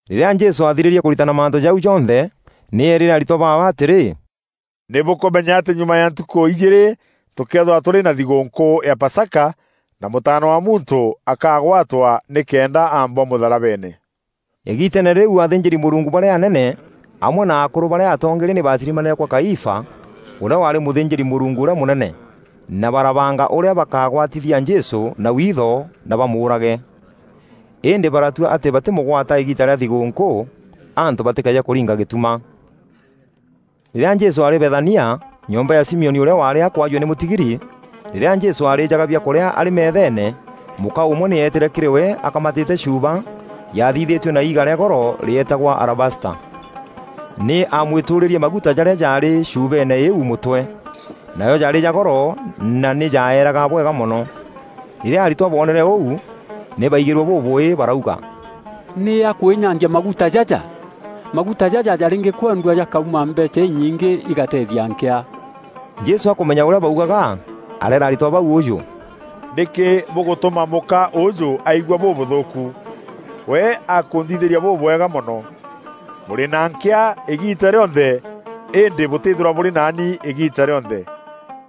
Rîrîa Jesû aathirîrie kûritana mantû jau jonthe, nî eerîre aritwa baawe atîrî, “Nî bûkûmenya atî nyuma ya ntukû ijîîrî tûkeethîrwa tûrî na thîgûûnkû ya Pasaka, na Mûtaana wa Muntû akagwatwa nîkenda aambwa mûtharabeene.” Îgiiteene rîu athînjîri-Mûrungu barîa anene amwe na akûrû barîa atongeeria nî baatirimanîre kwa Kaifa, ûrîa waarî mûthînjîri-Mûrungu ûrîa mûnene, na barabanga ûrîa bakaagwatithia Jesû na witho na bamûûrage. Îndî baratua atî batîmûgwata îgiita rîa thigûûnkû, antû batîkeeje kûringa gîtuma. Rîrîa Jesû aarî Bethania, nyomba ya Simioni ûrîa waarî akûajua nî mûtigiri, rîrîa Jesû aarîjaga biakûrîa arî metheene, mûka ûmwe nî eetîre kîrî we akamatîte chuuba yaathithîtue na iiga rîa goro rîetagwa alabasta. Nî aamwîtûûrîrie maguta jarîa jaarî chuubeene îîu mûtwe. Najo jaarî ja goro na nî jaeraga bwega mono. Rîrîa aritwa booneere ûu, nî baigîrue bûbûûî barauga, “Nî akwînyangia maguta jaja? Maguta jaja jarîngîkwendua jakauma mbeecha inyingî igateethia nkîa.” Jesû akûmenya ûrîa baugaga, areera aritwa bau ûjû, “Nîkî bûgûtûma mûka ûûjû aigua bûbûthûûku? We akunthithîria bûbwega mono. Bûrî na nkîa îgiita rîonthe îndî bûtîîthîrwa bûrî naani îgiita rîonthe.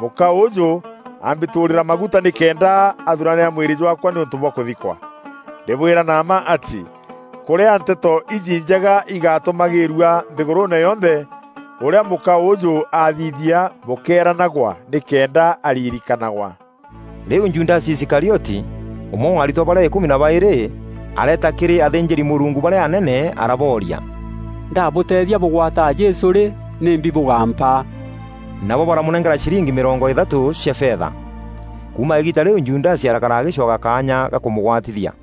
Mûka ûjû ambîtûûrîria maguta nîkenda athûranîra mwîrî jwaakwa nîûntû bwa kûthikwa. Ndîbwîra na mma atî, kûrîa Nteto iji Njega îgatûmagîîrua nthîgûrûûne yonthe, ûrîa mûka ûûjû athithia bûkeeranagwa nîkenda aririkanagwa.” Rîu Judasi Iskarioti, ûmwe wa aritwa barîa îkûmi na baîrî, areeta kîrî athînjîri-Mûrungu barîa anene arabooria, “Ndabûteethia bûgwata Jesû rî, nîmbi bûgaampa?” Nabo baramûnenkera ciringi mîrongo îthatû cia fetha. Kuuma îgiita rîu Judasi arakara agîcwaga kaanya ga kûmûgwatithia.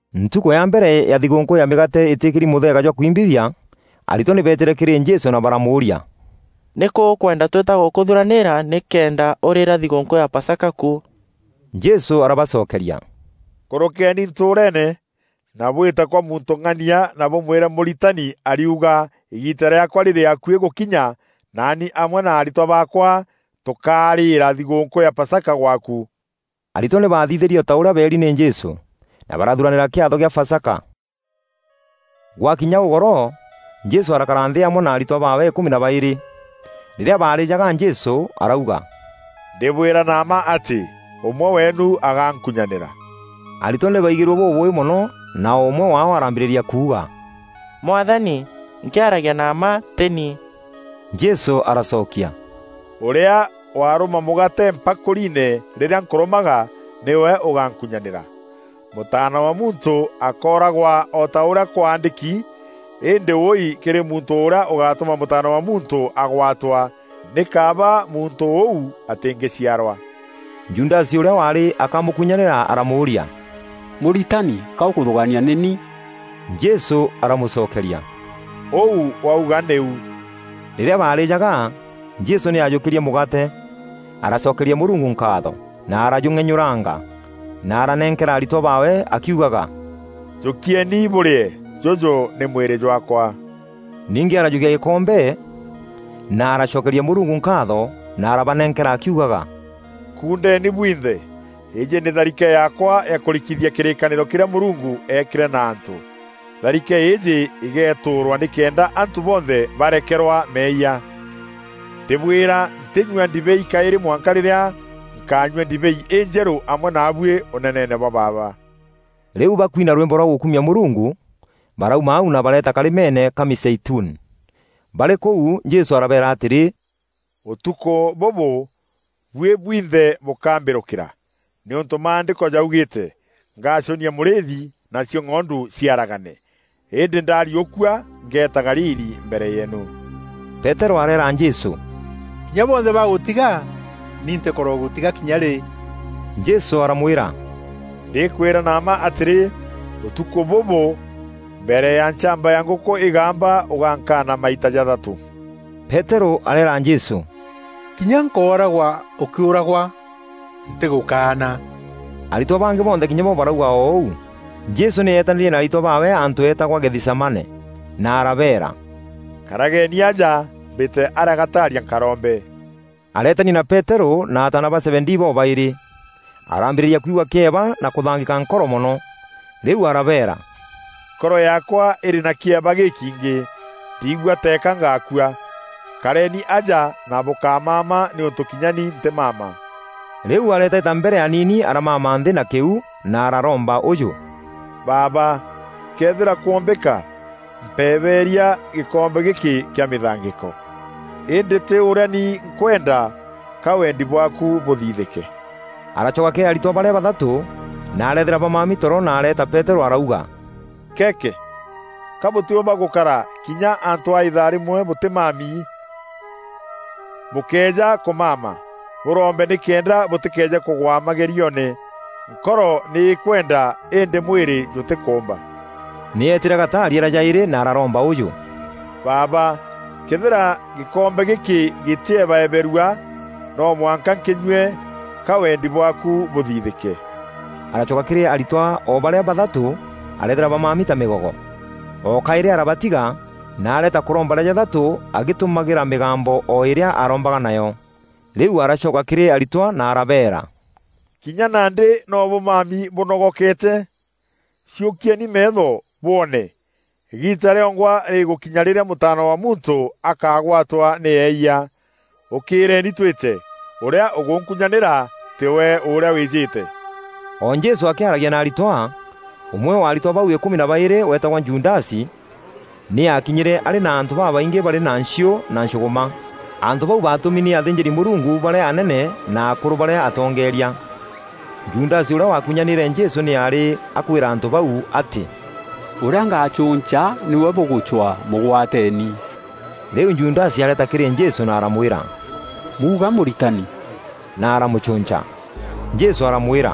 Ntukû ya mbere ya Thigûûnkû ya Mîgaate îtîkîri mûtheega jwa kwimbithia, aritwa nî beetîre kîrî Jesû na baramûûria, “Nîkû ûkwenda twîta gûkûthuranîîra nîkenda ûrîîra thigûûnkû ya Pasaka ku?” Jesû arabacokeria, “Kûrûkeeni ntûûreene, na bwîte kwa muntû ng'ania na bûmwîre ‘Mûritani ariuga îgiita rîaakwa rîrî akuî gûkinya nani amwe na aritwa baakwa tûkarîîra thigûûnkû ya Pasaka gwaaku.’” Aritwa nî baathithirie o ta ûrîa beeri nî Jesû, na barathuranîra kîatho kîa Pasaka. Gwakinya ûgoro, Jesû arakara nthî amwe na aritwa baawe îkûmi na baîrî. Rîrîa baarîîjaga, Jesû arauga, “Ndîbwîra na mma atî, ûmwe weenu agaankunyanîra.” Aritwa nî baigîrue bûbûûî mono na o ûmwe waao arambîrîria kunga, “Mwathani, nkîaragia na mma tî ni.” Jesû aracokia, “Ûrîa waarûma mûgaate mpakûriine rîrîa nkûrûmaga, nîwe ûgankunyanîra. Mûtaana wa Muntû akooragwa o ta ûrîa kwaandîki, îndî wûûi kîrî muntû ûrîa ûgatûma Mûtaana wa Muntû agwaatwa! Nî kaaba muntû ûu atîngîciarwa.” Judasi ûrîa waarî akamûkunyanîra aramûûria, “Mûritani ka ûkûthûgaania nî ni?” Jesû aramûcokeria, “Ûu wauga nîu.” Rîrîa baarîjaga, Jesû nî aajûkîrie mûgaate, aracokeria Mûrungu nkaatho, na arajûng'enyûranga, na aranenkera aritwa baawe akiugaga, “Jûkieni bûrîe; jûjû nî mwîrî jwaakwa.” Ningî arajûkia gîkombe, na aracokeria Mûrungu nkaatho, na arabanenkera akiugaga, “Kuundeeni bwinthe; îîjî nî tharike yaakwa ya kûrikithia kîrîkanîro kîrîa Mûrungu eekîre na antû. Tharike îîjî îgeetûûrwa nîkenda antû bonthe barekerwa meeyia. Ndîbwîra, ntînyua ndibei kaîrî mwanka rîrîa nkaanyua ndibei injerû amwe naabuî Ûneneene bwa Baaba.” Rîu, bakuina rwîmbo rwa gûkumia Mûrungu, barauma au na bareeta karîmeene ka Mîzeituni. Barî kûu Jesû arabeera atîrî, “Ûtukû bûbû, buî bwinthe bûkambîrûkîra, nîûntû Maandîko jaugîîte, ‘Ngacûnia mûrîîthi, nacio ng'ondu ciaragane.’ Îndî ndariûkua, ngeeta Galili mbere yeenu.” Peterû areera Jesû, “Kinya bonthe bagûtiga, ni ntîkorogûtiga kinya rî.” Jesû aramwîra, “Ndîkwîra na mma atîrî, ûtukû bûbû mbere ya nchamba ya ngûkû îgamba ûgankaana maita jathatû.” Peterû areera Jesû, “Kinya nkooragwa ûkîûragwa, ntîgûkaana.” Aritwa bangî bonthe kinya bo barauga o ûu. Jesû nî eetanîrie na aritwa baawe antû eetagwa Gethisemane, na arabeera, “Karageeni aja, mbîte arîa gataaria nkarombe.” Areetania na Peterû na ataana ba Zebedii bobaîrî. Arambîrîria kwigua kîeba na kûthangîka nkoro mono. Rîu arabeera, “Nkoro yaakwa îrî na kîeba gîkiingî, ndiigua teeka ngakua. Kareeni aja na bûkamama nîûntû kinya ni ntîmama.” Rîu areetaita mbere aniini aramama nthî na kîuu na araromba ûjû, “Baaba, këethîra kwombîka, mpebeeria gîkombe gîkî kîa mîthangîko. Îndî tî ûrîa ni nkwenda, ka weendi bwaaku bûthithîke.” Aracoka kîrî aritwa barîa bathatû, na areethîra bamami toro na areeta Peterû arauga, “Keeke! Ka bûtîûmba gûkara kinya antû a îthaa rîmwe bûtîmami? Bûkéeja kûmama, bûrombe nîkenda bûtîkeeje kûgwa magerioone. Nkoro nî îkwenda îndî mwîrî jûtîkûûmba.” Nî eetîre gataaria rîa jaîrî na araromba ûjû, “Baaba, këethîra gîkombe gîkî gîtîebaeberua, no mwanka nkînyue, ka weendi bwaaku bûthithîke.” Aracoka kîrî aritwa o barîa bathatû areethîra bamami ta mîgogo. O kaîrî arabatiga, na areeta kûromba rîa jathatû agîtumagîra mîgambo o îrîa arombaga nayo. Rîu aracoka kîrî aritwa na arabeera, “Kinya nandî no bûmami bûnogokeete? Ciûkieni meetho bwoone! Îgiita rîongwa rîgûkinya rîrîa Mûtaana wa Muntû akagwatwa nî eeyia. Ûkîîreeni twîte! Ûrîa ûgûnkunyanîra tîwe ûrîa wîîjîte.” O Jesû akîaragia na aritwa, ûmwe wa aritwa bau îkûmi na baîrî, weetagwa Judasi, nî aakinyîre arî na antû babaingî barî na nchiû na nchûgûma. Antû bau baatûmi nî athînjîri-Mûrungu barîa anene na akûrû barîa atongeeria. Judasi ûrîa waakûnyanîîre Jesû nî aarî akûîra antû bau atî, “Ûrîa ngacûnca nîwe bûgûcwaa, mûgwateeni.” Rîu Judasi areeta kîrî Jesû na aramwîra, “Muuga Mûritani,” na aramûcûnca. Jesû aramwîra,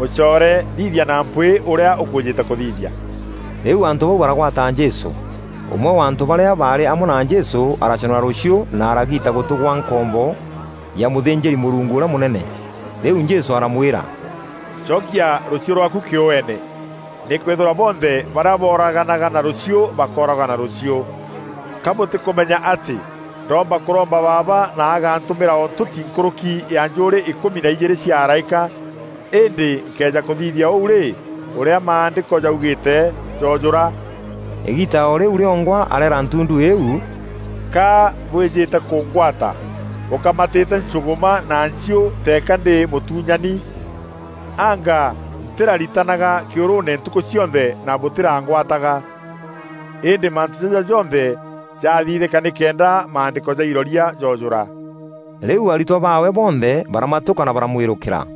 “Mûcoore, thithia na mpwîî ûrîa ûkwîjîte kûthithia.” Rîu antû bau baragwata Jesû. Ûmwe wa antû barîa baarî amwe na Jesû araconora rûchiû na aragiita gûtû kwa nkombo ya mûthînjîri-Mûrungu ûrîa mûnene. Rîu Jesû aramwîra, “Cokia rûchiû rwaaku kîûene, nîkwîthîrwa bonthe barîa booraganaga na rûchiû bakooragwa na rûchiû. Ka bûtîkûmenya atî ndomba kûromba Baaba na agantûmîra o ntûti nkûrûki ya njûûrî îkûmi na ijîîrî cia araîka? Îndî nkëeja kûthithia ûu rî, ûrîa Maandîko jaugîîte joojûra?” Îgiita o rîu rîongwa areera ntundu îîu, “Ka bwîjîte kûngwata bûkamatîte nchûgûma na nchiû teeka ndî mûtuunyani? Anga ntîraritanaga kîûrûûne ntukû cionthe na bûtîrangwataga? Îndî mantû jaja jonthe jaathithîka nîkenda Maandîko ja iroria joojûra.” Rîu aritwa baawe bonthe baramatûka na baramwîrûkîra.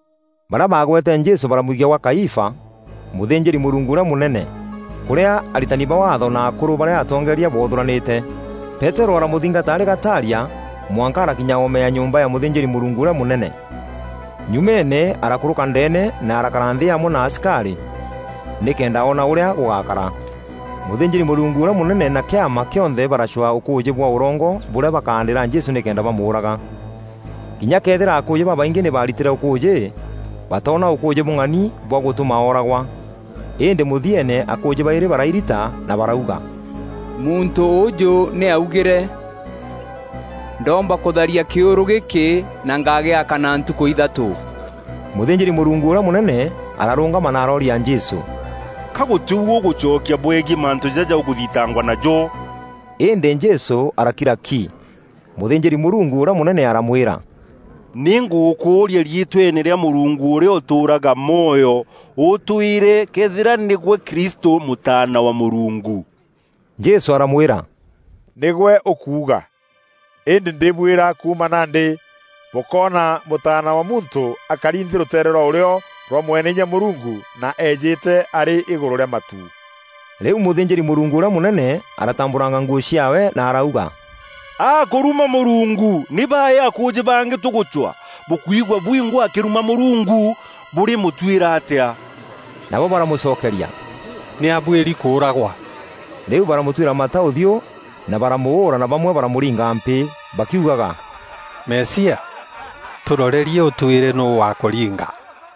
Barîa baagwete Jesû baramwikia kwa Kaifa, mûthînjîri-Mûrungu ûrîa mûnene, kûrîa aritani ba Waatho na akûrû barîa atongeeria boothûranîte. Peterû aramûthingata arî gataaria mwanka arakinya oome ya nyomba ya mûthînjîri-Mûrungu ûrîa mûnene. Nyumeene arakûrûka ndeene na arakara nthî amwe na asikarî, nîkenda oona ûrîa gûgaakara. Mûthînjîri-Mûrungu ûrîa mûnene na Kîama kîonthe baracwaa ûkûûjî bwa ûrongo bûrîa bakaandîra Jesû nîkenda bamûûraga. Kinya këethîra akûûjî babaingî nî baaritîre ûkûûjî, batoona ûkûûjî bûng'ani bwa gûtûma ooragwa. Îndî mûthieene akûûjî baîrî barairita na barauga, “Muntû ûjû nî aaugîre, ‘Ndomba kûtharia kîûrû gîkî na ngagîaka na ntukû ithatû.’” Mûthînjîri-Mûrungu ûrîa mûnene ararûngama na arooria Jesû, “Ka gûtî u ûgûcokia bwegiî mantû jaja ûkûthitangwa najo?” Îndî Jesû arakira ki. Mûthînjîri-Mûrungu ûrîa mûnene aramwîra, “Nîngûkûûria riîtweene rîa Mûrungu ûrîa ûtûûraga mwoyo, ûtwîre këethîra nîgwe Kristû, Mûtaana wa Mûrungu!” Jesû aramwîra, “Nîgwe ûkuuga! Îndî ndîbwîra kuuma nandî, bûkoona Mûtaana wa Muntû akari nthî rûteere rwa ûrîo rwa Mweneinya Mûrungu na eejîte arî îgûrû rîa matu.” Rîu mûthînjîri-Mûrungu ûrîa mûnene aratambûranga nguû ciaawe na arauga, “Akûruma Mûrungu! Nî baî akûûjî bangî tûgûcwaa? Bûkwigua bwingwa akîruma Mûrungu! Bûrî mûtwîra atîa?” Nabo baramûcokeria, “Nî abuîri kûûragwa.” Rîu baramûtwîra mata ûthiû na baramûûra na bamwe baramûringa mpîî, bakiugaga, “Mesia, tûrorerie ûtwîre nûû wakûringa!”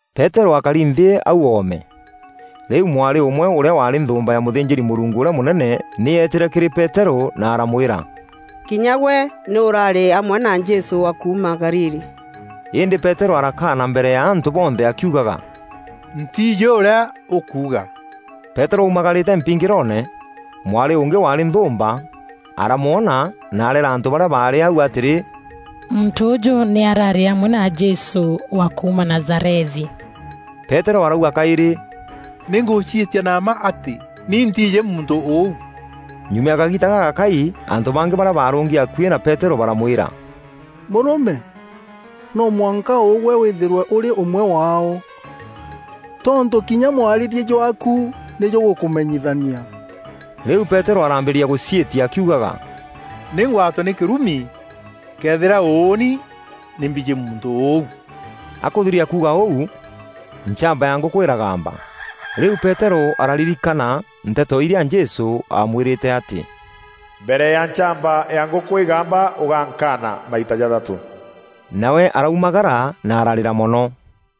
Peterû aakari nthî au oome. Rîu mwarî ûmwe ûrîa waarî nthûûmba ya mûthînjîri-Mûrungu ûrîa mûnene nî eetîre kîrî Peterû na aramwîra, “Kinya gwe nî ûraarî amwe na Jesû wa kuuma Galili.” Îndî Peterû arakaana mbere ya antû bonthe akiugaga, “Ntiijî ûrîa ûkuuga.” Peterû aumagarîte mpingîroone, mwarî ûngî waarî nthûûmba, aramwona na areera antû barîa baarî au atîrî, “Muntû ûjû nî araarî amwe na Jesû wa kuuma Nazarethi.” Peterû arauga kaîrî, “Nî ngûciîtia na mma atî ni ntiijî muntû ûu.” Nyuma ya kagiita gagakai antû bangî barîa baarûngi akuî na Peterû baramwîra, “Mûrûme! No mwanka ûgwe wîîthîrwe ûrî ûmwe waao! Tontû kinya mwarîrie jwaaku nî jûgûkûmenyithania.” Rîu Peterû araambîrîria gûciîtia akiugaga, “Nî ngwatwe nî kîrumi, këethîra ûûni nî mbijî muntû ûu!” Akûthiria kuuga ûu, nchamba ya ngûkû îragamba. Rîu Peterû araririkana nteto irîa Jesû aamwîrîte atî: “Mbere ya nchamba ya ngûkû îgamba ûgankaana maita jathatû.” Nawe araumagara na ararîra mono.